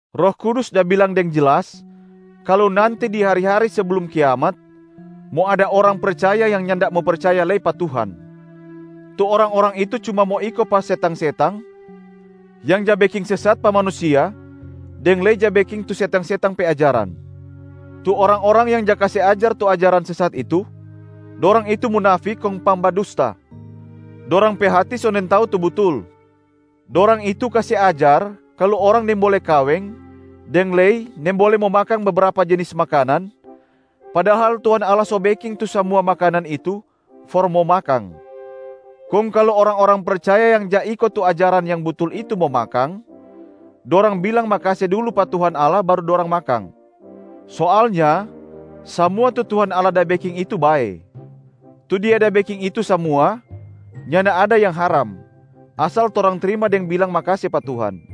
Roh Kudus da bilang deng jelas kalu nanti di hari-hari seblum kiamat, mo ada orang percaya yang nyanda mo percaya lei pa Tuhan. Tu orang-orang itu cuma mo iko pa setang-setang yang ja beking sesat pa manusia deng lei ja beking tu setang-setang pe ajaran. Tu orang-orang yang ja kase ajar tu ajaran sesat itu, dorang itu munafik kong pangbadusta, dorang pe hati so nintau tu butul. Dorang itu kase ajar kalu orang nimbole kaweng, deng lei nimbole mo makang bebrapa jenis makanan, padahal Tuhan Allah so beking tu samua makanan itu for mo makang. Kong kalu orang-orang percaya yang ja iko tu ajaran yang butul itu mo makang, dorang bilang makase dulu pa Tuhan Allah baru dorang makang. Soalnya samua tu Tuhan Allah da beking itu bae. Tu Dia da beking itu samua nyanda ada yang haram, asal torang trima deng bilang makase pa Tuhan.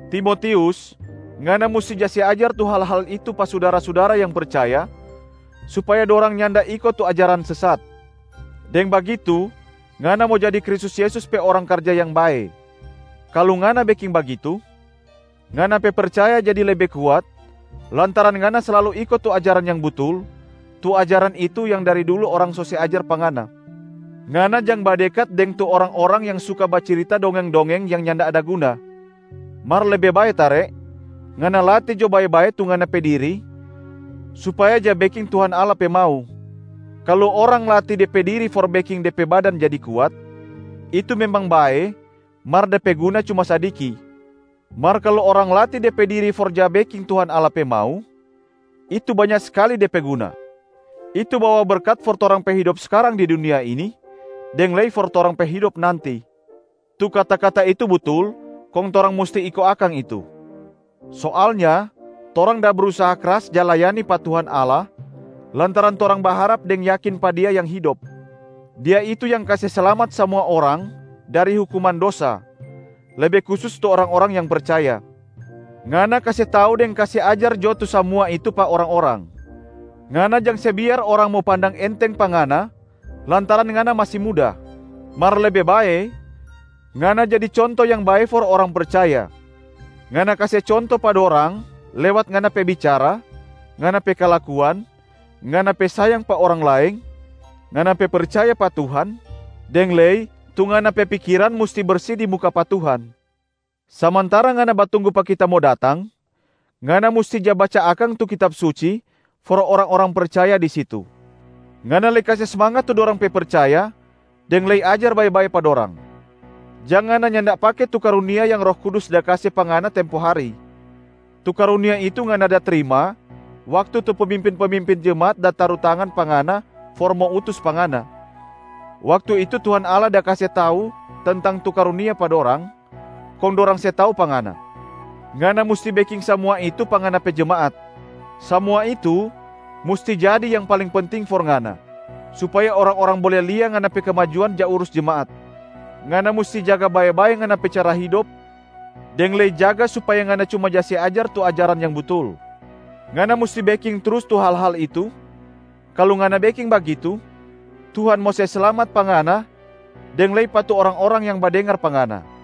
Timotius, ngana musti ja se ajar tu hal-hal itu pa sudara-sudara yang percaya supaya dorang nyanda iko tu ajaran sesat, deng bagitu ngana mo jadi Kristus Yesus pe orang karja yang bae. Kalu ngana beking bagitu, ngana pe percaya jadi lebe kuat lantaran ngana slalu iko tu ajaran yang butul, tu ajaran itu yang dari dulu orang so se ajar pa ngana. Ngana jang badekat deng tu orang-orang yang suka bacirita dongeng-dongeng yang nyanda ada guna. Mar lebe bae tare, ngana latih jo bae-bae tu ngana pe diri supaya ja beking Tuhan Allah pe mau. Kalu orang latih de pe diri for beking de pe badan jadi kuat, itu memang bae mar de pe guna cuma sadiki. Mar kalu orang latih de pe diri for ja beking Tuhan Allah pe mau, itu banya skali de pe guna. Itu bawa berkat for torang pe hidop skarang di dunia ini deng lei for torang pe hidop nanti. Tu kata-kata itu butul kong torang musti iko akang itu. Soalnya torang da brusaha kras ja layani pa Tuhan Allah lantaran torang baharap deng yakin pa Dia yang hidop. Dia itu yang kase slamat samua orang dari hukuman dosa, lebe kusus tu orang-orang yang percaya. Ngana kase tau deng kase ajar jo tu samua itu pa orang-orang. Ngana jang se biar orang mo pandang enteng pa ngana lantaran ngana masi muda. Mar lebe bae, ngana jadi conto yang bae for orang percaya. Ngana kase conto pa dorang lewat ngana pe bicara, ngana pe kalakuan, ngana pe sayang pa orang laeng, ngana pe percaya pa Tuhan, deng lei tu ngana pe pikiran musti bersi di muka pa Tuhan. Samantara ngana batunggu pa kita mo datang, ngana musti ja baca akang tu Kitab Suci for orang-orang percaya di situ. Ngana lei kase smangat tu dorang pe percaya deng lei ajar bae-bae pa dorang. Jang ngana nyanda pake tu karunia yang Roh Kudus da kase pa ngana tempo hari. Tu karunia itu ngana da trima waktu tu pemimpin-pemimpin jemaat da taru tangan pa ngana for mo utus pa ngana. Waktu itu Tuhan Allah da kase tau tentang tu karunia pa dorang, kong dorang se tau pa ngana. Ngana musti beking samua itu pa ngana pe jemaat. Samua itu musti jadi yang paling penting for ngana, supaya orang-orang bole lia ngana pe kemajuan ja urus jemaat. Ngana musti jaga bae-bae ngana pe cara hidop deng lei jaga supaya ngana cuma ja se ajar tu ajaran yang butul. Ngana musti beking trus tu hal-hal itu, kalu ngana beking bagitu Tuhan mo se slamat pa ngana deng lei pa tu orang-orang yang badengar pa ngana.